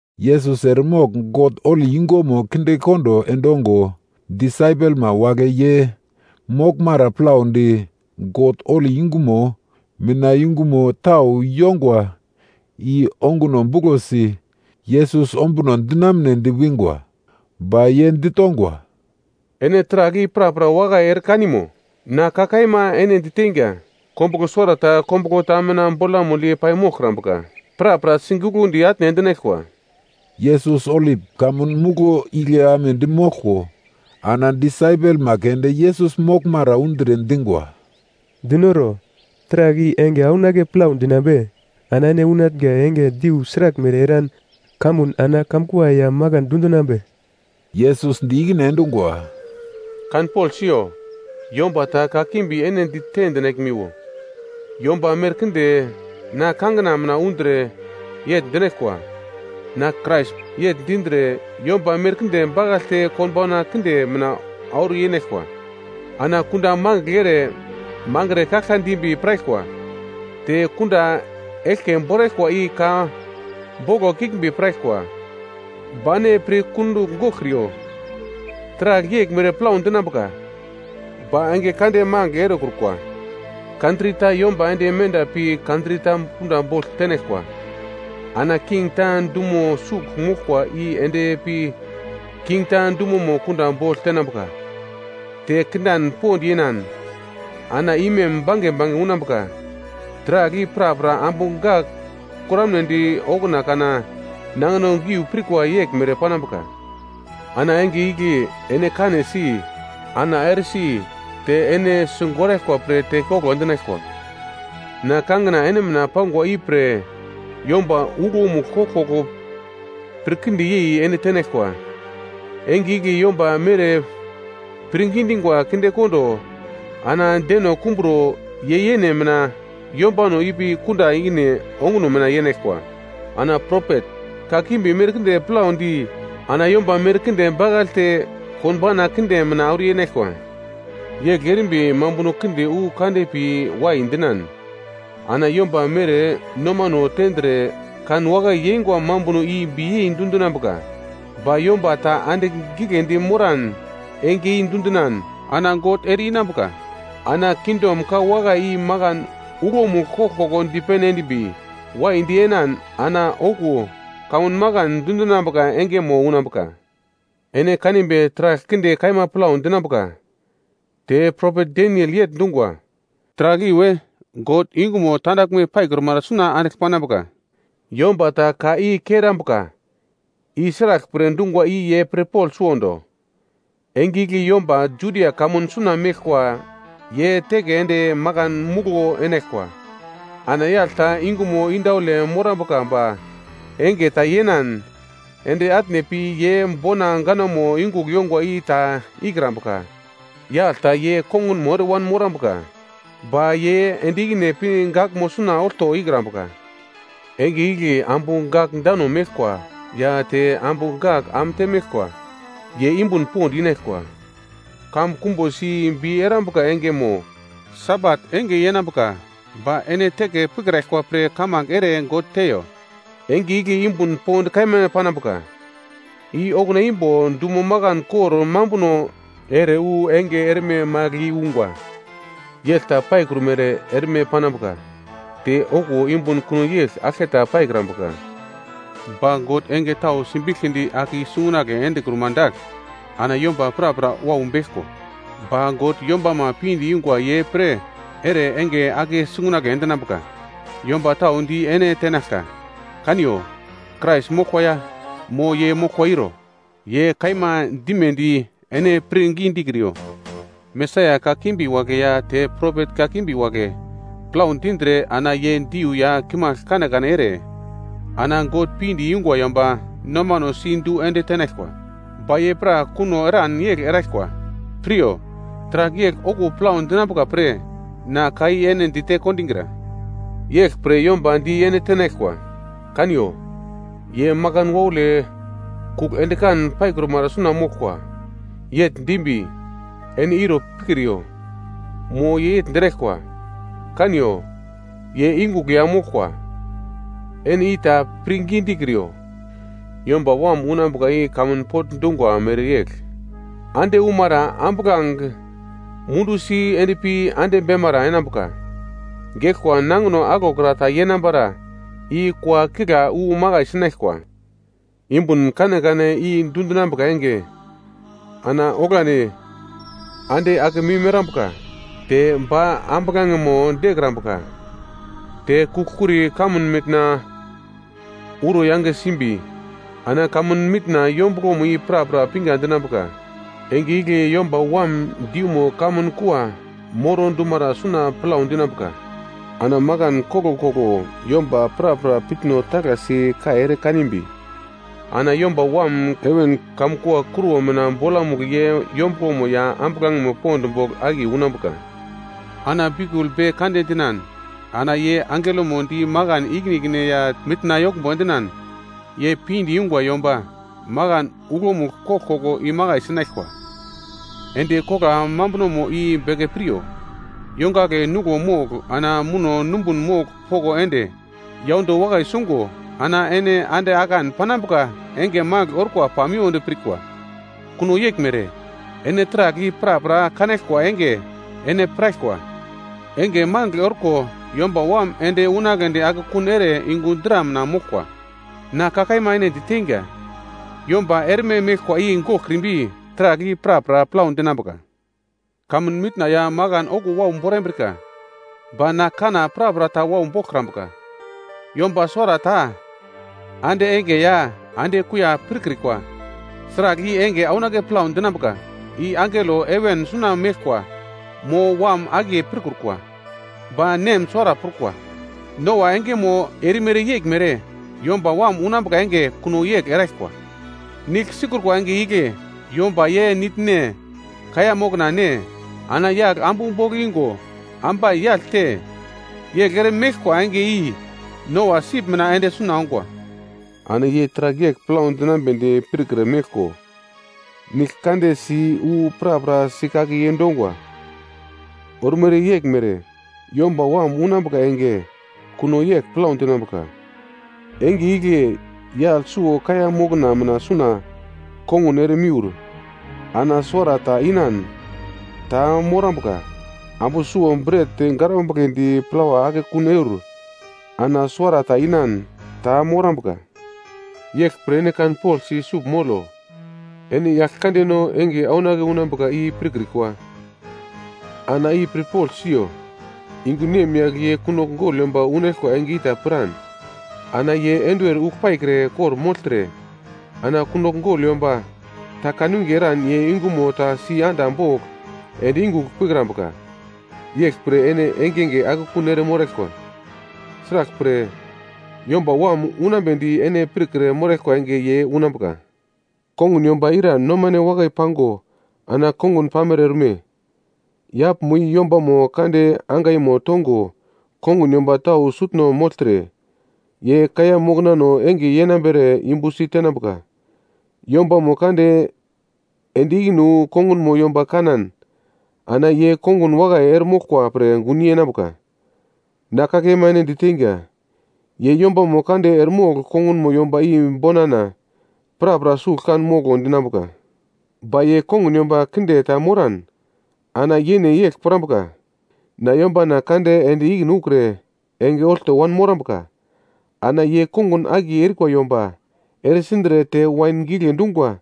Yesus eremogl God holi yungumo kindekondo endongo, disaipelma wagle ye moglmara plaudi God holi yungumo mina yungumo tau yongwa i onguno buglosi Yesus ombuno dinamunedi wingwa. Ba ye ditongwa, “Ene taragl i prapra wakai ere kanimo? Na ka kaima ene diteinga, kombuglo suwarata kombuglo ta mina bolamugl yei-pai moglkrambuka. Prapra siguglundi atne endinaglkwa.” Yesus Olip Kamun Muglo igle amedi moglko, ana disaipelma keunde Yesus moglmara undre dingwa, “Dinoro, taragl i enge aunake plau dinambe? Ana ene unatnga enge diu sraglmere eran kamuno ana kamkua ya makan dundinambe?” Yesus di ikine endungwa, “Kanpogl siyo. Yomba ta kakimbi ene dite dinaglmiwo. Yomba merkinde na kangina mina undre yegl dinaglkwa, ‘Na Krais’ yegl dindre, yomba merkinde bakaglte konbauna kinde mina auro yenaglkwa. Ana kunda mangigl ere mangre kaglka dimbi piraglkwa, te kunda eglke boraglkwa i ka boglo kiglmbi piraglkwa. Ba ene pir kundugl goglkriyo, taragl yeglmere plau dinambuka, ba enge kande magl erekrukwa. Kantri ta yomba ende menda pi kantri ta kunda bogl tenaglkwa, ana king ta dumo sugl moglkwa i endpi king ta dumomo kunda bogl tenambuka. Te kindan pond yenan, ana imem bange bange unambuka. Taragl i prapra ambu gak kuramnedi okuna kana nangino giu pirkwa yeglmere panambuka. “Ana enge igle ene kanesi, ana eresi te ene sigoraglkwa pre tekoglo endinaglkwa. Na kangina ene mina pangwa ipre yomba uglomugl koglkoglo pir kinde yei ene tenaglkwa. Enge igle yomba mere pirngi dingwa kindekondo, ana deno kumbro ye yene mina yombano ipi kunda ikine onguno mina yenaglkwa. Ana propet kakimbi merkinde plaudi ana yomba merkinde bakaglte konbauna kinde mina auro yenaglkwa. Yegl erimbi mambuno kinde wu kande pi wai dinan, ana yomba mere nomano tendre kanwakai yeingwa mambuno i biyei dundinambuka. Ba yomba ta andigl giglendi moran enge i dundinan, ana God ere-inambuka. Ana kingdom ka wakai i makan uglomugl koglkoglo dipene endimbi, waidi enan ana okuwo kamun makan dundinambuka engemo unambuka. “Ene kanimbi taragl kinde kaima plau dinambuka, te propet Daniel yegl dungwa, ‘Taragl iwe God yungumo tandaglme paikrumara suna andigl panambuka.’ Yomba ta ka i kerambuka, i sraglpre dungwa i ye pirpogl suwondo. Enge igle yomba Judia kamun suna meglkwa ye teke ende makan muglo enaglkwa. Ana yagl ta yungumo indaule morambuka ba enge ta yenan ende atne pi ye bona ganamo yungugl yongwa i ta ikrambuka. Yagl ta ye kongunmo ere wanmorambuka, ba ye ende ikine pi gaglmo suna olto ikrambuka. Enge igle ambu gak dano meglkwa ya te ambu gak am temeglkwa, ye yumbun pond inaglkwa. Kamun kumbosi bi erambuka enge mo Sabat enge yenambuka, ba ene teke pikraglkwa pre kamange ere God teiyo. Enge igle yumbun pond kaima panambuka, i okuna imbo dumo makan kor mambuno ere wu enge erme magl i ungwa. Yegl ta paikrumere erme panambuka. Te okuwo yumbun kuno yegl aglketa paikrambuka. Ba God enge tau simbiglkidi ake i-sungunagle endekruma dagl, ana yomba prapra wau beglko, ba God yombama pinde yungwa ye pre ere enge ake sungunagle endinambuka. Yomba tau di ene tenaglkwa, ‘Kaniyo, Krais moglkwa ya, mo ye moglkwa iro.’ Ye kaima dimedi ene pirngi dikriyo. Mesaia kakimbi wagle ya te propet kakimbi wagle plau dindre ana ye diu ya kimagl kanekane ere ana God pinde yungwa yomba nomano si du ende tenaglkwa. Ba ye pra kuno eran yegl eraglkwa. Piryo taragl yegl okuwo plau dinambuka pre na ka i ene dite kondigra. “Yeglpre, yomba di ene tenaglkwa, ‘Kaniyo, ye makan waule kugl endikan paikrumara suna moglkwa.’ Yegl dimbi, ene iro pikriyo, mo ye dinaglkwa, ‘Kaniyo, ye yungugl ya moglkwa,’ ene i ta pirngi dikriyo. Yomba Wam unambuka i kamun pogl dungwa mereyegl, ande umara ambuglange mundu si endpi ande beimara enambuka. Geglkwa nangino aglokra ta yenambara, i kua kigla wu makai sinaglkwa. “Yumbun kanekane i dundinambuka enge, ana oglandi “‘ande akemim erambuka, te ba ambuglangemo dekrambuka, te kugl-kuri kamun mitna uro yange simbi, ana kamun mitna yombuglomo i prapra pinga dinambuka.’ “Enge igle Yomba Wam diumo kamun kua moro endumara suna plau dinambuka. Ana makan koglkoglo yomba prapra piutno taglasi kai ere kanimbi, ana Yomba Wam heven kamun kua kruwo mina bolamugl ye yombuglomo ya ambuglangemo pond bogl akiye unambuka. Ana biukul be kande dinan, ana ye angelomo di makan ikine ikine ya mitna yoglmbo endinan, ye pinde yungwa yomba makan uglomugl koglkoglo imakai sinaglkwa. “Endi kogla mambunomo i beke piryo, yongagle nuglo mogl ana muno numbun mogl poko ende yaundo wakai sungo ana ene ande akan panambuka enge magl orkwa pamiwodi pirkwa. Kuno yeglmere, ene taragl i prapra kanaglkwa enge ene piraglkwa, enge magl orko Yomba Wam ende unagledi akekun ere yungu dra mina moglkwa. Na ka kaima ene diteinga, yomba erme meglkwa i goglkrimbi, taragl i prapra plau dinambuka. Kamun mitna ya makan okuwo wau borambrika. Ba na kanna prapra ta wau boglkrambuka. “Yomba suwarata ande enge ya ande kuiya pirkrikwa. Sragl i enge aunake plau dinambuka, i angelo heven suna meglkwa, mo Wam akiye pirkrukwa. Ba Nem suwara prukwa. Noa engemo erimere yeglmere, yomba Wam unambuka enge kuno yegl eraglkwa. Nigl sikrukwa enge igle yomba ye nigl ne, kaiya mokna ne, ana yagl ambu bogl ingo, ambai yagl te, yegl ere meglkwa enge i Noa sip mina ende suna ongwa. Ana ye taragl yegl plau dinambedi pirkre meglko, nigl kande si wu prapra sikake yendongwa. Ormere yeglmere, Yomba Wam unambuka enge kuno yegl plau dinambuka. Enge igle yagl suwo kaiya mokna mina suna kongun ere miur, ana suwarata inan, ta morambuka. Ambu suwo bret garambugledi plawa akekun eur, ana suwarata inan, ta morambuka. “Yeglpre ene kanpoglsi sugl molo, ene Yaglkandeno enge aunake unambuka i pirkrikwa. Ana i pirpogl siyo. Yungu nemyagl ye kunogl gogl yomba unaglkwa enge i ta piran, ana ye enduwer ugl paikre kor-mogltre, ana kunogl gogl yomba ta kanwinge eran ye yungumo ta si anda bogl ende yungugl pikrambuka. Yeglpre ene engenge akekun ere moraglkwa. Sraglpre, Yomba Wam unambedi ene pirkre moraglkwa enge ye unambuka. “Kongun yomba ira nomane wakai pango ana kongun pamere orme? Yaglmo i yombamo kande angaimo tongo kongun yomba tau sutno mogltre, ye kaiya moknano enge yenambere yumbusi tenambuka. Yombamo kande ende ikine wu kongunmo yomba kanan ana ye kongun wakai eremoglkwa pre gun yenambuka. Na ka kaima ene diteinga, ye yombamo kande eremogl kongunmo yomba i bonana, prapra sugl kan moglo dinambuka. Ba ye kongun yomba kinde ta moran ana yene yegl pirambuka, ‘Na yombana kande ende ikine ukre enge olto wanmorambuka.’ Ana ye kongun akiye erikwa yomba ere sindre te wain gigle dungwa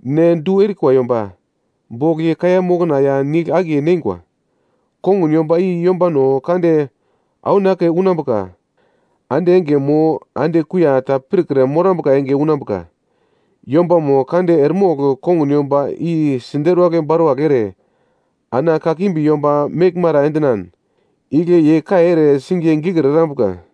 ne du erikwa yomba bogl ye kaiya mokna ya nigl akiye neingwa. Kongun yomba i yombano kande aunake unambuka ande enge mo ande kuiya ta pirkre morambuka enge unambuka. Yombamo kande eremogl kongun yomba i siderwagl baruwagl ere, ana kakimbi yomba meglmara endinan, igle ye kai ere singiye gikir erambuka.